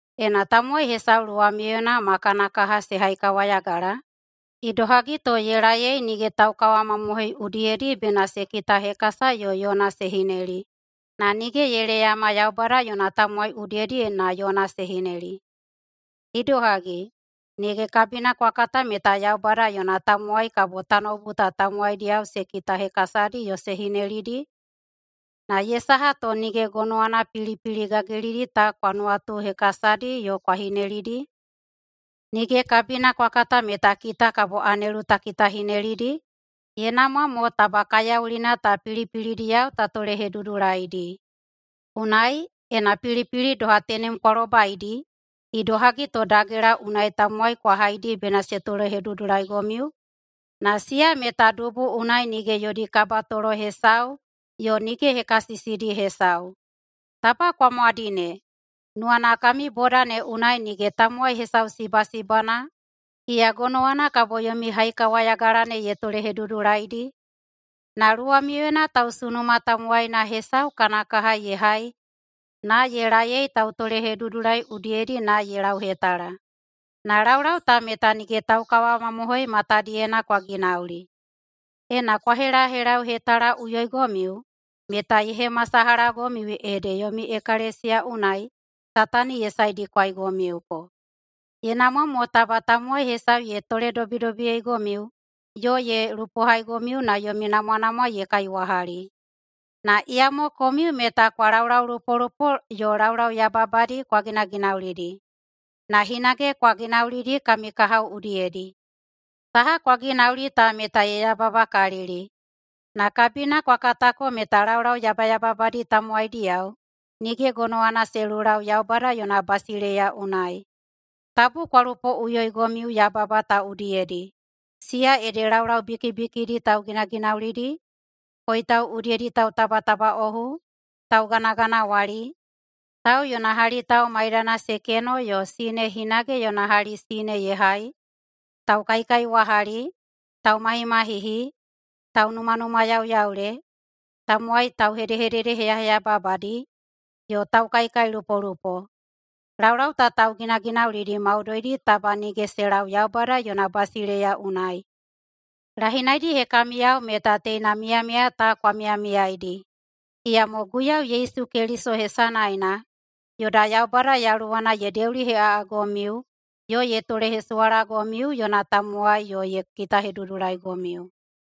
Ena tamowai hesau luwamiuyena ma kana kaha se haikawayagala, idohagi to ye laei nige taukawamamohoi udiyedi bena se kitahekasa yo yona se hineli, na nige ye leyama Yaubada yona tamowai udiyedi na yona se hineli. Idohagi, nige kabina kwa kata meta Yaubada yona tamowai kabo tanoubu ta tamowaidiyao se kitahekasadi yo se hinelidi? Na ye saha to nige gonowana pilipili gagilidi ta kwa nuwatuhekasadi yo kwa hinelidi? Nige kabina kwa kata meta kita kabo anelu ta kitahinelidi? Ye namwa mo taba kaiyaulina ta pilipilidiyao ta tolehedudulaidi. Unai, ena pilipili doha tenem kwa lobaidi, idohagi to dagela unai tamowai kwa haidi bena se tolehedudulaigomiu? Na siya meta dubu unai nige yodi kabatolo hesau yo nige hekasisidi hesau. Taba kwa mwadine! Nuwana kami boda ne unai nige tamowai hesau sibasibana iya gonowana kabo yomi haikawayagala ne ye tolehedudulaidi? Na luwamiuyena tausunuma tamowaina hesau kana kaha ye hai na ye laei tautolehedudulai udiyedi na ye lauhetala. Na laulau ta meta nige taukawamamohoi matadiyena kwa ginauli. Ena kwa helahelauhetalaꞌuyoigomiu meta ye hemasalahagomiu ede yomi ekalesiya unai Satani ye saedikwaigomiuko. Ye namwa mo taba tamowai hesau ye toledobidobiyeigomiu yo ye lupohaigomiu na yomi namwanamwa ye kaiwahali. Na iyamo komiu meta kwa laulaulupolupo yo laulau yababadi kwa ginaginaulidi, na hinage kwa ginaulidi kami kahao udiyedi. Saha kwa ginauli ta meta ye yababakalili. Na kabina kwa katako meta laulau yabayababadi tamowaidiyao nige gonowana se lulau Yaubada yona basileiya unai. Tabu kwa lupoꞌuyoigomiu yababa ta udiyedi, siya ede laulau bikibikidi tauginaginaulidi, koitau udiyedi tautabatabaꞌohu, tauganaganawali, tau yona hali tau maidana se keno yo sine hinage yona hali sine ye hai, taukaikaiwahali, taumahimahihi, taunumanumayauyaule, tamowai tauhededeheyaheyababadi, yo taukaikailupolupo. Laulau ta tauginaginaulidi maudoidi taba nige se lau Yaubada yona basileiya unai. Lahinaidi hekamiyao meta teina miyamiya ta kwa miyamiyaidi. Iyamo Guiyau Yesu Keliso hesanaena yoda Yaubada Yaluwana ye deuliheꞌaꞌagomiu yo ye tolehesuwalagomiu yona tamowai yo ye kitahedudulaigomiu.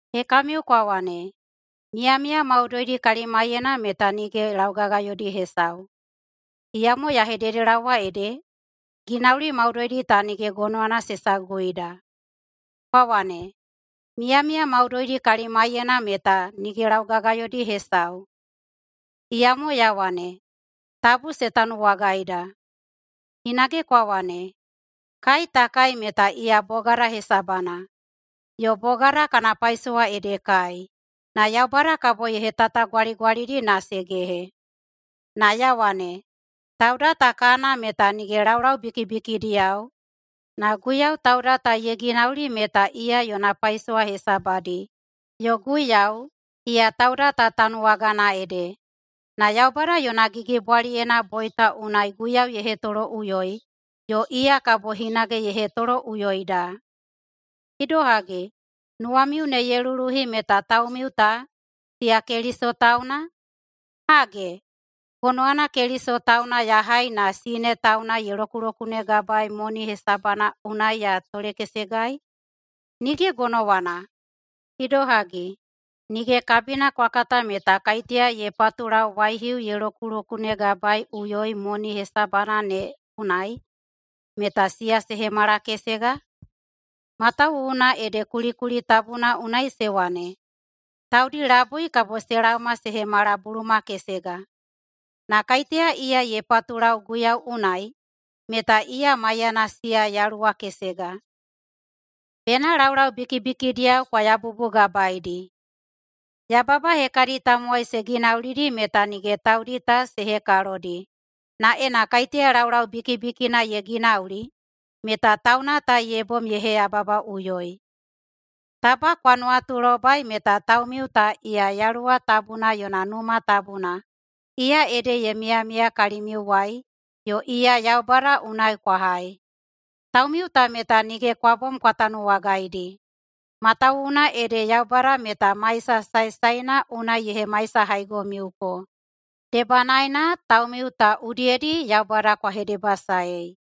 Hekamiu kwa wane, “Miyamiya maudoidi kalimaiyena meta nige laugagayodi hesau.” Iyamo ya hededelaowa ede, ginauli maudoidi ta nige gonowana se saguida. Kwa wane, “Miyamiya maudoidi kalimaiyena meta nige laugagayodi hesau.” Iyamo ya wane, tabu se tanuwagaida. Hinage kwa wane, “Kai ta kai meta iya bogada hesabana, yo bogada kana paisowa ede kai, na Yaubada kabo ye hetatagwaligwalidi na se gehe.” Na ya wane, tauda ta kana meta nige laulau bikibikidiyao, na Guiyau tauda ta ye ginauli meta iya yona paisowa hesabadi, yo Guiyau, iya tauda ta tanuwagana ede. Na Yaubada yona gigibwaliyena boita unai Guiyau ye hetoloꞌuyoi, yo iya kabo hinage ye hetoloꞌuyoida. Idohagi, nuwamiu ne ye luluhi meta taumiu ta, siya Keliso tauna? Hage, gonowana Keliso tauna ya hai na sine tauna ye lokulokunegabaei moni hesabana unai ya tolekesegai? Nige gonowana. Idohagi, nige kabina kwa kata meta kaiteya ye patulau waihiu ye lokulokunegabaeꞌuyoi moni hesabana ne unai, meta siya se hemala kesega? Matawuwuna ede kulikuli tabuna unai se wane, “Taudi labui kabo se laoma se hemala buluma kesega.” Na kaiteya iya ye patulau Guiyau unai meta iya maiyana siya yaluwa kesega. Bena laulau bikibikidiyao kwa yabubugabaeidi! Yababa hekadi tamowai se ginaulidi meta nige taudi ta se hekalodi, na ena kaiteya laulau bikibikina ye ginauli meta tauna ta ye bom ye heyababaꞌuyoi. Taba kwa nuwatulobai meta taumiu ta iya Yaluwa tabuna yona Numa Tabuna, iya ede ye miyamiya kalimiuwai yo iya Yaubada unai kwa hai. Taumiu ta meta nige kwa bom kwa tanuwagaidi. Matawuwuna ede Yaubada meta maisa saesaena unai ye hemaisahaigomiuko. Debanaena taumiu ta udiyedi Yaubada kwa hedebasaei.